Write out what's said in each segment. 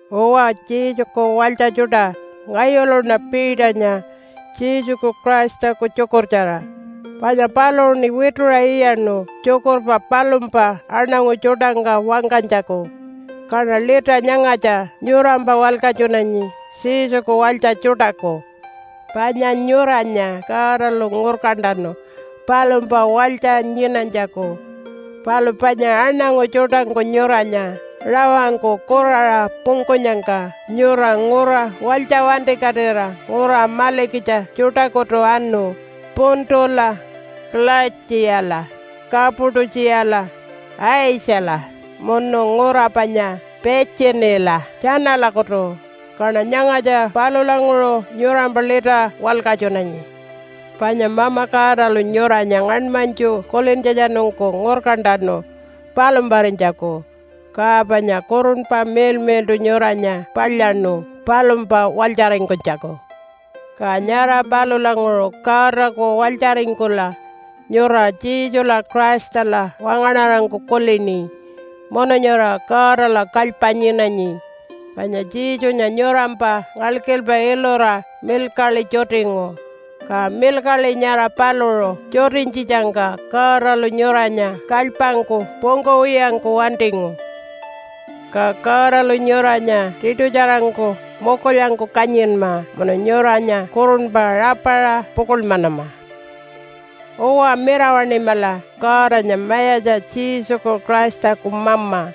Uwa, Jesuku walytja tjuṯa, ngayuluṉa Peternya Jesuku Christaku tjukurtjara panya paluṟuṉi wituṟa iyaṉu tjukurpa palumpa aṉangu tjuṯangka wangkanytjaku. Kaṉa lita nyangatja nyurampa walkatjunanyi Jesuku walytja tjuṯaku. Panya nyuranya Godalu ngurkantanu palumpa walytja nyinanytjaku. Palu panya aṉangu tjuṯangku nyuranya rawangku kuraṟa pungkunyangka nyura ngura walytja wantikatira ngura malikitja tjuṯakutu anu Puntula, Kalaitjiyala, Kapatu-tjiyala, Aitjala munu ngura panya Pitjiniyala tjanalakutu. Kaṉa nyangatja palulanguṟu nyurampa lita walkatjunanyi. Panya Mama Godalu nyuranya ngaṉmanytju kulintjatjanungku ngurkantanu palumparinytjaku, ka panya Kurunpa Miḻmiḻṯu nyuranya palyaṉu palumpa walytjaringkunytjaku. Ka nyara palulanguṟu Godaku walytjaringkula nyura Jesula Christala wangaṉarangku kulini munu nyura Godala kalypa nyinanyi, panya Jesunya nyurampa ngalkilpa ilura milkaḻi tjutingu, ka milkaḻi nyara paluṟu tjutinytjitjangka Godalu nyuranya kalypangku pungkuwiyangku wantingu. Ka Godalu nyuranya tiṯutjarangku mukulyangku kanyinma munu nyuranya kurunpa rapaṟa pukuḻmanama. Uwa, mirawaṉimala Godanya Mayatja Jesuku Christaku Mama,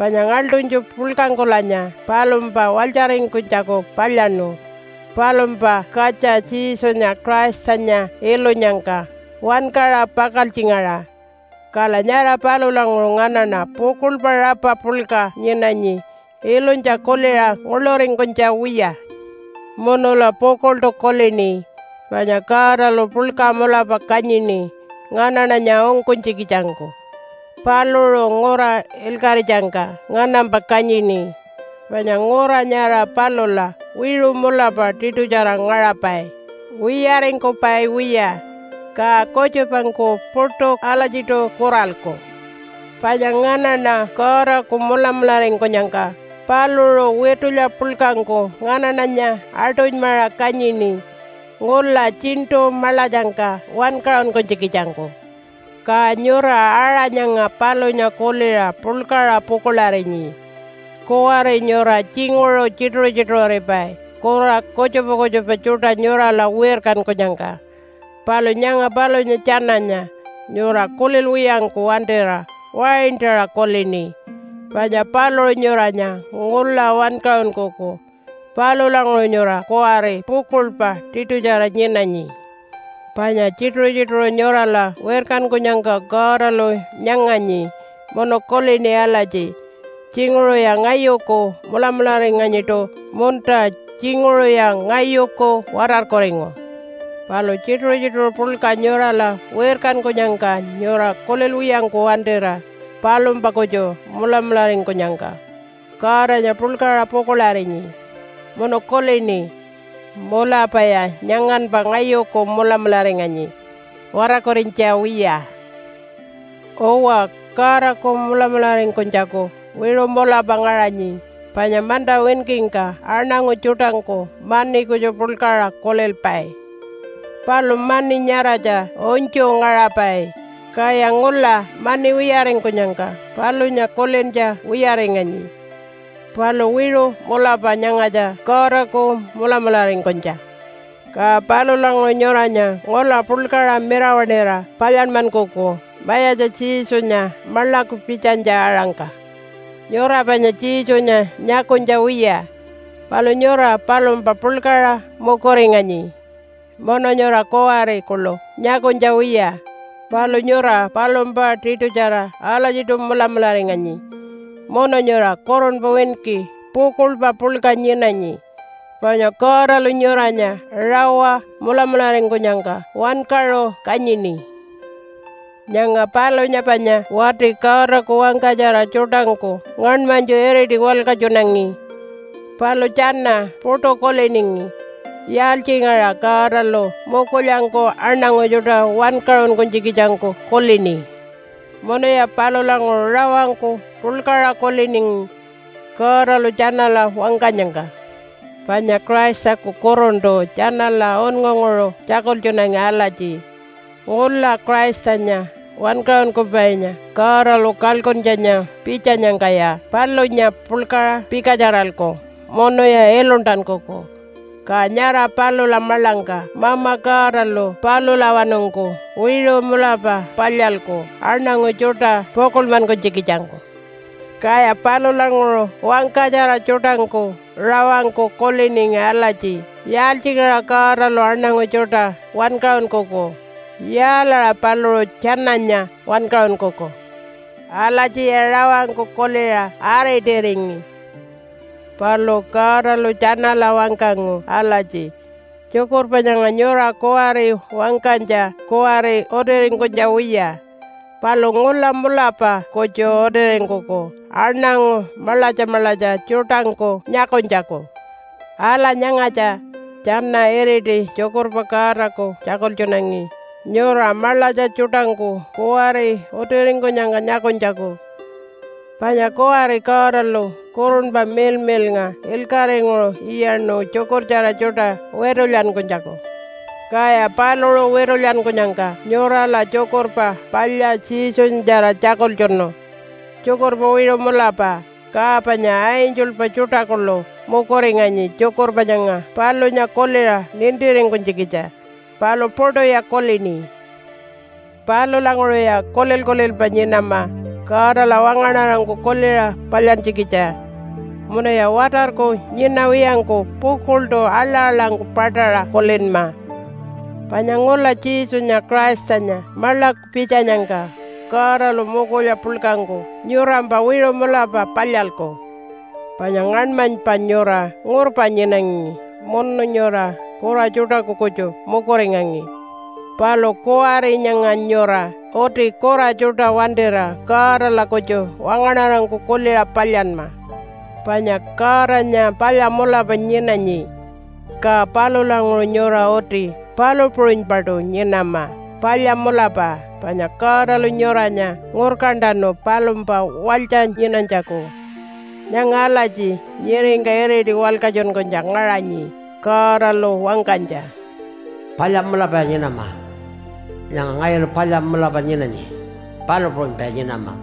panya ngaḻṯunytju puḻkangkulanya palumpa walytjaringkunytjaku palyaṉu, palumpa katja Jesunya Christanya ilunyangka wankaṟa pakaltjingaṟa. Kala nyara palulanguṟu nganaṉa pukuḻpa rapa puḻka nyinanyi ilunytja kuliṟa nguḻuringkunytja wiya. Munula pukuḻṯu kulini panya Godalu puḻka mulapa kanyini nganaṉanya ungkunytjikitjangku. Paluṟu ngura ilkaṟitjangka nganampa kanyini, panya ngura nyara palula wiṟu mulapa tiṯutjara ngaṟapai, wiyaringkupai wiya, ka kutjupangku puṯu alatjiṯu kuralku. Panya nganaṉa Godaku mulamularingkunyangka paluṟu witulya puḻkangku nganaṉanya aṯunymaṟa kanyini ngula Tjiṉṯu Maḻatjangka wankaṟunkunytjikitjangku. Ka nyura aṟa nyanga palunya kuliṟa puḻkaṟa pukuḻarinyi. Kuwari nyura tjinguṟu tjituṟu-tjituṟuripai kura kutjupa kutjupa tjuṯa nyurala wirkankunyangka, palu nyanga palunya tjananya nyura kulilwiyangku wantira waintaṟa kulini panya paluṟu nyuranya ngula wankaṟunkuku. Palulanguṟu nyura kuwari pukuḻpa tiṯutjara nyinanyi. Panya tjituṟu-tjituṟu nyurala wirkankunyangka Godalu nyanganyi munu kulini alatji, “Tjinguṟuya ngayuku mulamularinganyiṯu munta tjinguṟuya ngayuku watarkuringu.” Palu tjituṟu-tjituṟu puḻka nyurala wirkankunyangka nyura kulilwiyangku wantira palumpa kutju mulamularingkunyangka Godanya puḻkaṟa pukuḻarinyi munu kulini, “Mulapaya nyanganpa ngayuku mulamularinganyi watarkurinytja wiya.” Uwa, Godaku mulamularingkunytjaku wiṟu mulapa ngaṟanyi. Panya manta winkingka aṉangu tjuṯangku mani kutju puḻkaṟa kulilpai, palu mani nyaratja unytju ngaṟapai, kaya ngula mani wiyaringkunyangka palunya kulintja wiyaringanyi, palu wiṟu mulapa nyangatja Godaku mulamularingkunytja. Ka palulanguṟu nyuranya ngula puḻkaṟa mirawaṉira palyanmankuku Mayatja Jesunya maḻaku pitjanytja-aṟangka. Nyura panya Jesunya nyakunytja wiya, palu nyura palumpa puḻkaṟa mukuringanyi. Munu nyura kuwari kuḻu nyakunytja wiya, palu nyura palumpa tiṯutjara alatjiṯu mulamularinganyi, munu nyura kurunpa winki pukuḻpa puḻka nyinanyi, panya Godalu nyuranya rawa mulamularingkunyangka wankaṟu kanyini. Nyanga palunya panya wati Godaku wangkatjara tjuṯangku ngaṉmanytju iriti walkatjunangi. Palu tjana puṯu kuliningi, “Yaaltjingaṟa Godalu mukulyangku aṉangu tjuṯa wankaṟunkunytjikitjangku kulini?” Munuya palulanguṟu rawangku puḻkaṟa kuliningi Godalu tjanala wangkanyangka. Panya Christaku Kurunṯu tjanala unngunguṟu tjakultjunangi alatji, “Ngula Christanya Wankaṟunkupainya Godalu kalkuntjanya pitjanyangkaya palunya puḻkaṟa pikatjaralku munuya iluntankuku. Ka nyara palula maḻangka Mama Godalu palulawanungku wiṟu mulapa palyalku aṉangu tjuṯa pukuḻmankunytjikitjangku.” Kaya palulanguṟu wangkatjara tjuṯangku rawangku kuliningi alatji, “Yaaltjingaṟa Godalu aṉangu tjuṯa wankaṟunkuku? Yaalaṟa paluṟu tjananya wankaṟunkuku?” Alatjiya rawangku kuliṟa aritiringi. Palu Godalu tjanala wangkangu alatji, “Tjukurpa nyanga nyura kuwari wangkanytja kuwari utiringkunytja wiya, palu ngula mulapa kutju utiringkuku aṉangu maḻatja maḻatja tjuṯangku nyakunytjaku.” Ala nyangatja, tjana iriti tjukurpa Godaku tjakultjunangi nyura maḻatja tjuṯangku kuwari utiringkunyangka nyakunytjaku. Panya kuwari Godalu Kurunpa Miḻmiḻnga ilkaṟinguṟu iyaṉu tjukurtjara tjuṯa witulyankunytjaku, kaya paluṟu witulyankunyangka nyurala Tjukurpa Palya Jesunyatjara tjakultjunu tjukurpa wiṟu mulapa. Ka panya angelpa tjuṯa kuḻu mukuringanyi tjukurpa nyanga palunya kuliṟa nintiringkunytjikitja, palu puṯuya kulini. Palulanguṟuya kulil-kulilpa nyinama Godala wangaṉarangku kuliṟa palyantjikitja. Munuya watarku nyinawiyangku pukuḻṯu aḻa-aḻangku paṯaṟa kulinma panya ngula Jesunya Christanya maḻaku pitjanyangka Godalu mukulya puḻkangku nyurampa wiṟu mulapa palyalku. Panya ngaṉmanypa nyura ngurpa nyinangi munu nyura kura tjuṯaku kutju mukuringangi. Palu kuwari nyanga nyura uti kura tjuṯa wantira Godala kutju wangaṉarangku kuliṟa palyanma. Panya Godanya palya mulapa nyinanyi. Ka palulanguṟu nyura uti palu puṟunypaṯu nyinama palya mulapa, panya Godalu nyuranya ngurkantanu palumpa walytja nyinanytjaku. Nyanga alatji nyiringka iriti walkatjunkunytja ngaṟanyi Godalu wangkanytja, “Palya mulapaya nyinama. Nyanga ngayulu palya mulapa nyinanyi, palu puṟunypaya nyinama.”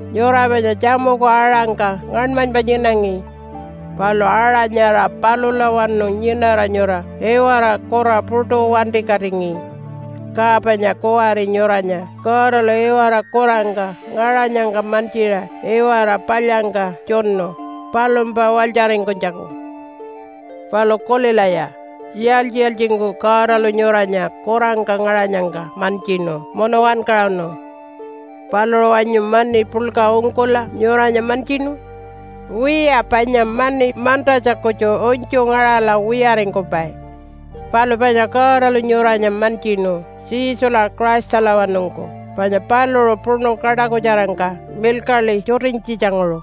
Nyura panya tjamuku aṟangka ngaṉmanypa nyinangi, palu aṟa nyara palulawanu nyinara nyura iwara kura puṯu wantikatingi. Ka panya kuwari nyuranya Godalu iwara kurangka ngaṟanyangka mantjiṟa iwara palyangka tjunu palumpa walytjaringkunytjaku. Palu kulilaya, yaaltji-yaaltjingku Godalu nyuranya kurangka ngaṟanyangka mantjinu munu wankaṟunu? Paluṟu wanyu mani puḻka ungkula nyuranya mantjinu? Wiya, panya mani mantatja kutju unytju ngaṟala wiyaringkupai. Palu panya Godalu nyuranya mantjinu Jesula Christalawanungku panya paluṟu puṉu kaṯakutjarangka milkaḻi tjutinytjitjanguṟu.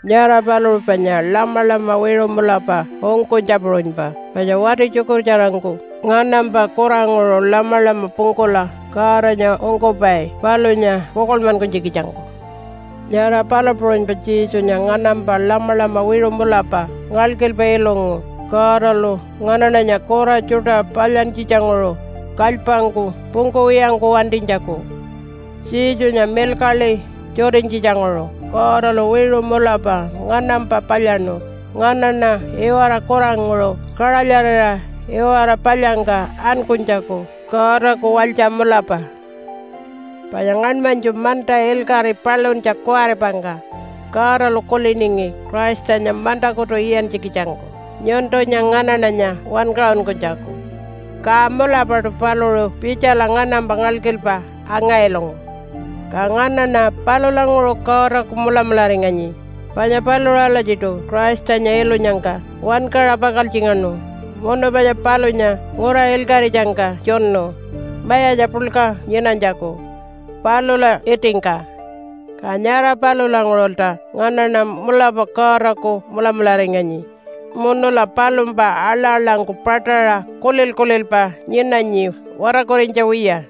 Nyara paluṟu panya lamalama wiṟu mulapa ungkunytja puṟunypa, panya wati tjukurtjarangku nganampa kuranguṟu lamalama pungkula Godanya ungkupai palunya pukuḻmankunytjikitjangku, nyara palu puṟunypa Jesunya nganampa lamalama wiṟu mulapa ngalkilpa ilungu Godalu nganaṉanya kura tjuṯa palyantjitjanguṟu kalypangku pungkuwiyangku wantinytjaku. Jesunya milkaḻi tjutinytjitjanguṟu Godalu wiṟu mulapa nganampa palyaṉu nganaṉa iwara kuranguṟu kaṟalyarira iwara palyangka ankunytjaku Godaku walytja mulapa. Panya ngaṉmanytju manta ilkaṟi paluntja kuwaripangka Godalu kuliningi Christanya mantakutu iyantjikitjangku nyuntunya nganaṉanya wankaṟunkunytjaku. Ka mulapaṯu paluṟu pitjala nganampa ngalkilpa anga-ilungu. Ka nganaṉa palulanguṟu Godaku mulamularinganyi, panya paluṟu alatjiṯu Christanya ilunyangka wankaṟa pakaltjingaṉu munu panya palunya ngura ilkaṟitjangka tjunu mayatja puḻka nyinanytjaku palula itingka. Ka nyara palulanguṟulta nganaṉa mulapa Godaku mulamularinganyi munula palumpa aḻa-aḻangku paṯaṟa kulil-kulilpa nyinanyi, watarkurinytja wiya.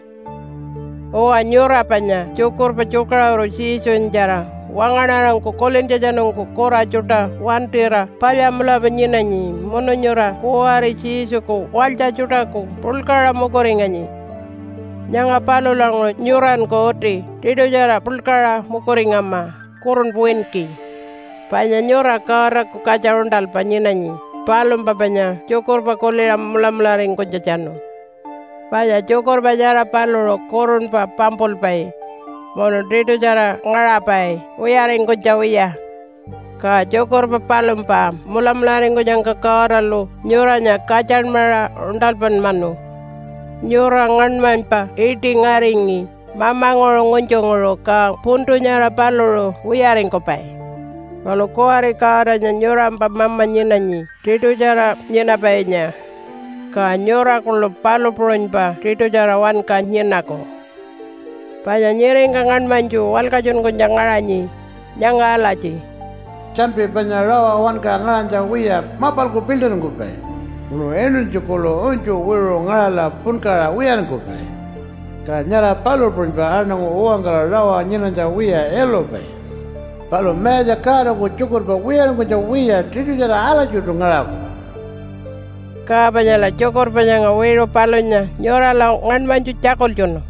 Uwa, nyura panya tjukurpa tjukaṟuru Jesunyatjara wangaṉarangku kulintjatjanungku kura tjuṯa wantira palya mulapa nyinanyi munu nyura kuwari Jesuku walytja tjuṯaku puḻkaṟa mukuringanyi. Nyanga palulanguṟu nyuranku uti tiṯutjara puḻkaṟa mukuringama kurunpa winki. Panya nyura Godaku katja uṉṯalpa nyinanyi palumpa panya tjukurpa kuliṟa mulamularingkunytjatjanu. Panya tjukurpa nyara paluṟu kurunpa pampulpai munu tiṯutjara ngaṟapai wiyaringkunytja wiya. Ka tjukurpa palumpa mulamularingkunyangka Godalu nyuranya katjanmaṟa uṉṯalpanmanu. Nyura ngaṉmanypa iṯi ngaringi mamanguṟu ngunytjunguṟu, ka puntu nyara paluṟu wiyaringkupai. Palu kuwari Godanya nyurampa mama nyinanyi tiṯutjara nyinapainya, ka nyura kuḻu palu puṟunypa tiṯutjara wanka nyinaku. Panya nyiringka ngaṉmanytju walkatjunkunytja ngaṟanyi nyanga alatji, “Tjanpi panya rawa wanka ngaṟanytja wiya mapalku piḻṯiringkupai, munu inuntji kuḻu unytju wiṟu ngaṟala punkaṟa wiyaringkupai. Ka nyara palu puṟunypa aṉangu uwankara rawa nyinanytja wiya ilupai. Palu Mayatja Godaku tjukurpa wiyaringkunytja wiya tiṯutjara alatjiṯu ngaṟaku.” Ka panyala tjukurpa nyanga wiṟu palunya nyurala ngaṉmanytju tjakultjunu.